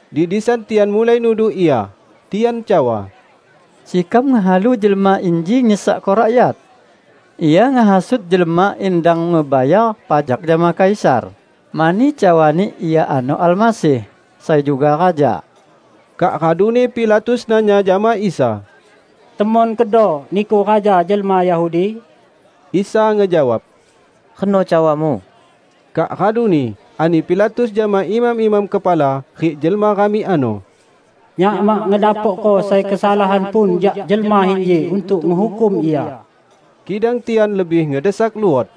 Di disan tian mulai nuduh Ia. Tian cawa, "Sekam ngehalu Jelma inji nyesekko rakyat. Ia ngehasut jelma in dang ngebayar pajak jama Kaisar, mani cawani Ia ano Almasih, sai juga Raja." Kak raduni Pilatus nanya jama Isa, "Temon kedo Niku raja jelma Yahudi?" Isa ngejawab, "Reno cawamu." Kak raduni ani Pilatus jama imam-imam kepala rik jelma ramik ano, "Nyak mak ngedapokko sai kesalahan pun jak Jelma inji untuk ngehukum Ia." Kidang tian lebih ngedesak luot,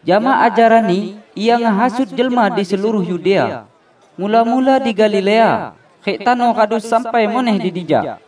"Jama ajaran-Ni, Ia ngehasut jelma di seluruh Yudea; mula-mula di Galilea, rik tano radu sampai muneh di dija."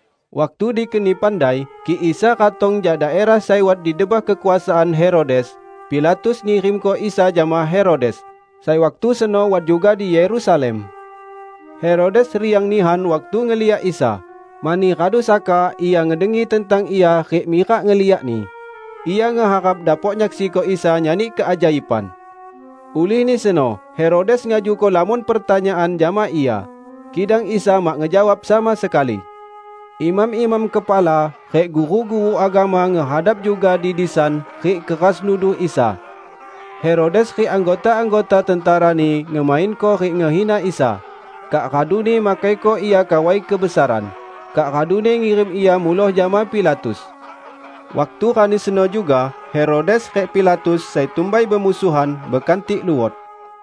Waktu dikeni pandai kik Isa ratong jak daerah sai wat di debah kekuasaan Herodes, Pilatus ngirimko Isa jama Herodes, sai waktu seno wat juga di Yerusalem. Herodes riang nihan waktu ngeliak Isa, mani radu saka ia ngedengi tentang Ia rik mirak ngeliak-Ni. Ia ngeharap dapok nyaksiko Isa nyani keajaiban. Ulihni seno Herodes ngajuko lamon pertanyaan jama Ia, kidang Isa mak ngejawab sama sekali. Imam-imam kepala rik guru-guru agama ngehadap juga di disan rik keras nuduh Isa. Herodes rik anggota-anggota tenterani ngemainko rik ngehina Isa, kak raduni makaiko Ia kawai kebesaran, kak raduni ngirim Ia muloh jama Pilatus. Waktu rani seno juga Herodes rik Pilatus, sai tumbai bemusuhan, bekantik luot.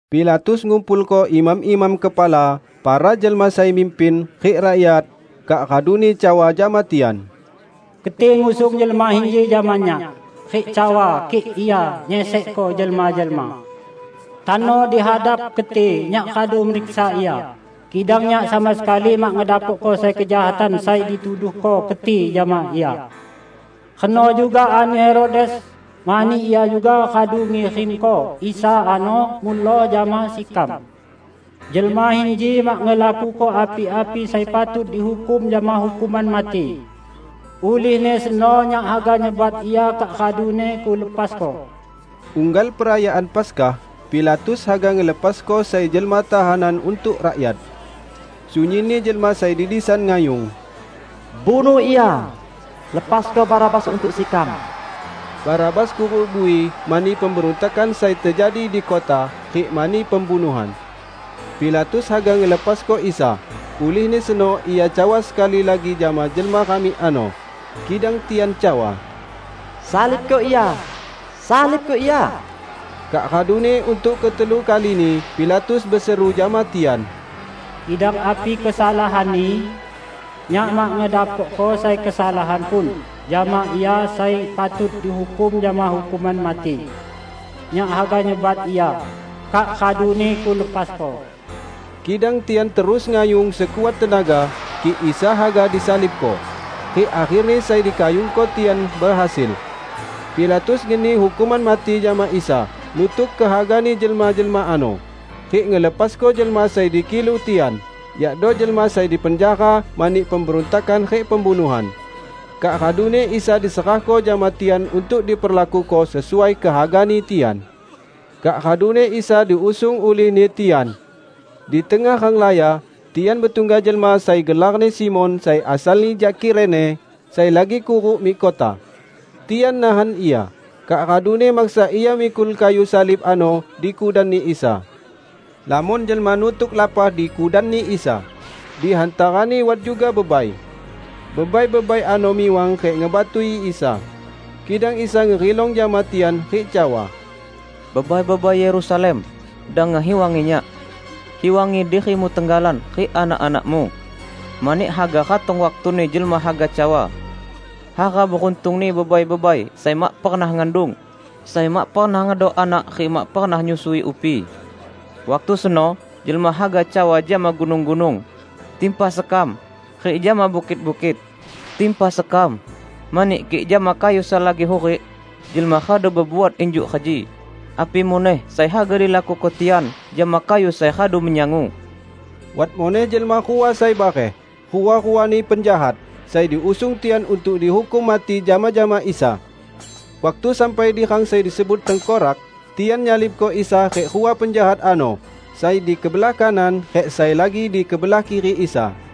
Pilatus ngumpulko imam-imam kepala, para jelma sai mimpin, rik rakyat, kak raduni cawa jama tian, "Keti ngusung Jelma inji jama nyak rik cawa kik Ia nyesekko jelma-jelma. Tano di hadap keti nyak radu meriksa Ia, kidang nyak sama sekali mak ngedapokko sai kejahatan sai dituduhko keti jama Ia. Reno juga ani Herodes, mani ia juga radu ngirimko Isa ano muloh jama sekam. Jelma inji mak ngelakuko api-api sai patut dihukum jama hukuman mati. Ulihni seno nyak haga nyebat Ia kak raduni kulepasko." [ Unggal perayaan Paskah, Pilatus haga ngelepasko sai jelma tahanan untuk rakyat.] Sunyinni jelma sai di disan ngayung, "Bunuh Ia! Lepasko Barabas untuk sekam!" ( Barabas kuruk bui mani pemberuntakan sai tejadi di kota rik mani pembunuhan.) Pilatus haga ngelepasko Isa, ulihni seno ia cawa sekali lagi jama jelma ramik ano. Kidang tian cawa, "Salibko Ia! Salibko Ia!" Kak raduni untuk ketelu kalini Pilatus beseru jama tian, "Kidang api kesalahan-Ni? Nyak mak ngedapokko sai kesalahan pun jama Ia sai patut dihukum jama hukuman mati! Nyak haga nyebat Ia, kak raduni kulepasko." Kidang tian terus ngayung sekuat tenaga kik Isa haga disalibko. Rik akherni sai dikayungko tian behasil. Pilatus ngeni hukuman mati jama Isa nutuk kehagani jelma-jelma ano, rik ngelepasko jelma sai dikilu tian, yakdo jelma sai dipenjara mani pemberuntakan rik pembunuhan. Kak raduni Isa diserahko jama tian untuk diperlakuko sesuai kehagani tian. Kak raduni Isa diusung ulihni tian. Di tengah ranglaya, tian betungga jelma sai gelarni Simon, sai asalni jak Kirene, sai lagi kuruk mik kota. Tian nahan ia, kak raduni maksa ia mikul kayu salib ano di kudanni Isa. Lamon jelma nutuk lapah di kudanni Isa -- di hantarani wat juga bebai. Bebai-bebai ano miwang rik ngebatui Isa. Kidang Isa ngerilong jama tian rik cawa, "Bebai-bebai Yerusalem! Dang ngehiwangi Nyak. Hiwangi dirimu tenggalan rik anak-anakmu. Mani haga ratong waktuni jelma haga cawa, 'Hara beruntungni bebai-bebai sai mak pernah ngandung, sai mak pernah ngedok anak rik mak pernah nyusui upi!' Waktu seno jelma haga cawa jama gunung-gunung, 'Timpa sekam!' Rik jama bukit-bukit, 'Timpa sekam!' Mani kik jama kayu sai lagi hurik, jelma radu bebuat injuk reji, api muneh sai haga dilakuko tian jama kayu sai radu menyangu!" Wat muneh jelma rua sai bareh -- rua-ruani penjahat -- sai diusung tian untuk dihukum mati jama-jama Isa. Waktu sampai di rang sai disebut "Tengkorak", tian nyalibko Isa rik rua penjahat ano -- sai di kebelah kanan rik sai lagi di kebelah kiri Isa.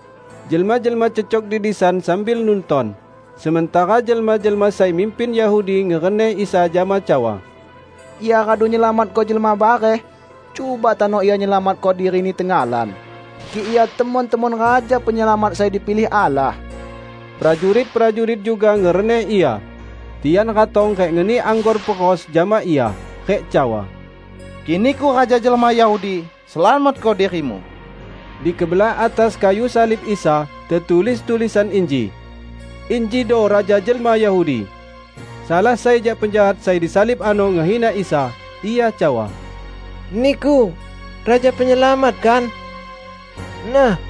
Jelma-jelma cecok di disan sambil nunton, sementara jelma-jelma sai mimpin Yahudi ngereneh Isa jama cawa, "Ia radu nyelamatko jelma bareh; cuba tano Ia nyelamatko diri-Ni tenggalan, kik Ia temon-temon Raja Penyelamat sai dipilih Allah!" Prajurit-prajurit juga ngereneh Ia. Tian ratong rik ngeni anggor peros jama Ia rik cawa, "Kik Niku raja jelma Yahudi, selamatko diri-Mu!" Di kebelah atas kayu salib Isa, tetulis tulisan inji: "Injido Raja Jelma Yahudi." Salah sai jak penjahat sai disalib ano ngehina Isa. Ia cawa, "Niku Raja Penyelamat, kan? Nah,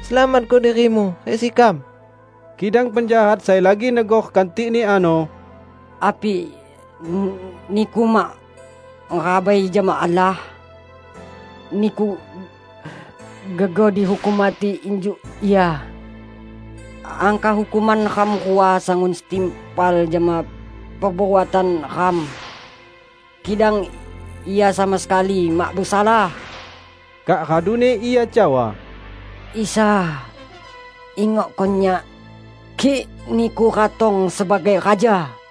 selamatko diri-Mu rik sekam!" Kidang penjahat sai lagi negor kantikni ano, "Api niku mak merabai jama Allah? Niku gegoh dihukum mati injuk Ia. Angkah hukuman ram rua sangun setimpal jama perbuatan neram. Kidang Ia sama sekali mak besalah!" Kak raduni ia cawa, "Isa, ingokko nyak, kik Niku ratong sebagai Raja!"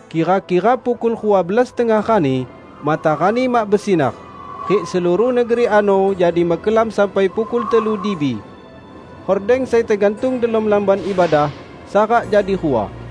Kira-kira pukul rua belas tengah rani, matarani mak besinar, rik seluruh negeri ano jadi mekelam sampai pukul telu dibi. Hordeng sai tegantung delom Lamban Ibadah, sarak jadi rua.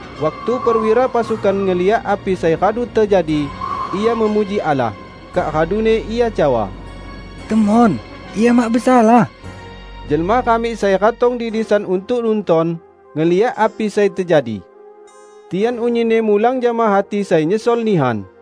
Waktu perwira pasukan ngeliak api sai radu tejadi, ia memuji Allah. Kak raduni ia cawa, "Temon, Ia mak besalah!" Jelma ramik sai ratong di disan untuk nunton, ngeliak api sai tejadi. Tian unyinni mulang jama hati sai nyesol nihan.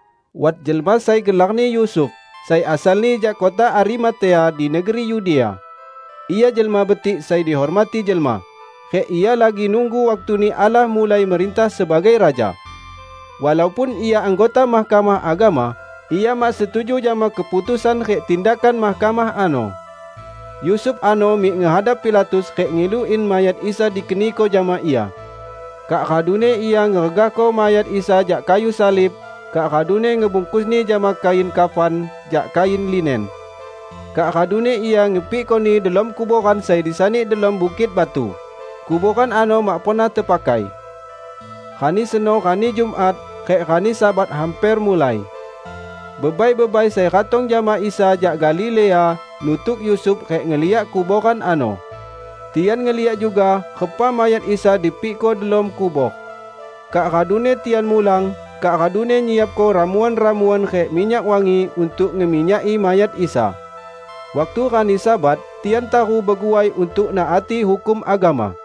Wat jelma sai gelarni Yusuf, sai asalni jak kota Arimatea di negeri Yudea. Ia jelma betik sai dihormati jelma, rik ia lagi nunggu waktuni Allah mulai merintah sebagai Raja. Walaupun ia anggota Mahkamah Agama, ia mak setuju jama keputusan rik tindakan mahkamah ano. Yusuf ano mik ngehadap Pilatus rik ngilu in mayat Isa dikeniko jama ia. Kak raduni ia ngeregahko mayat Isa jak kayu salib, kak raduni ngebungkusni jama kain kafan jak kain linen. Kak raduni ia ngepikkoni delom kuboran sai disani delom bukit batu -- kuboran ano mak pernah tepakai. Rani seno rani Jumat; rik rani Sabat hamper mulai. Bebai-bebai sai ratong jama Isa jak Galilea nutuk Yusuf rik ngeliak kuboran ano. Tian ngeliak juga repa mayat Isa dipikko delom kubor. Kak raduni tian mulang kak raduni nyiapko ramuan-ramuan rik minyak wangi untuk ngeminyaki mayat Isa. Waktu rani Sabat, tian taru beguai untuk naati hukum agama.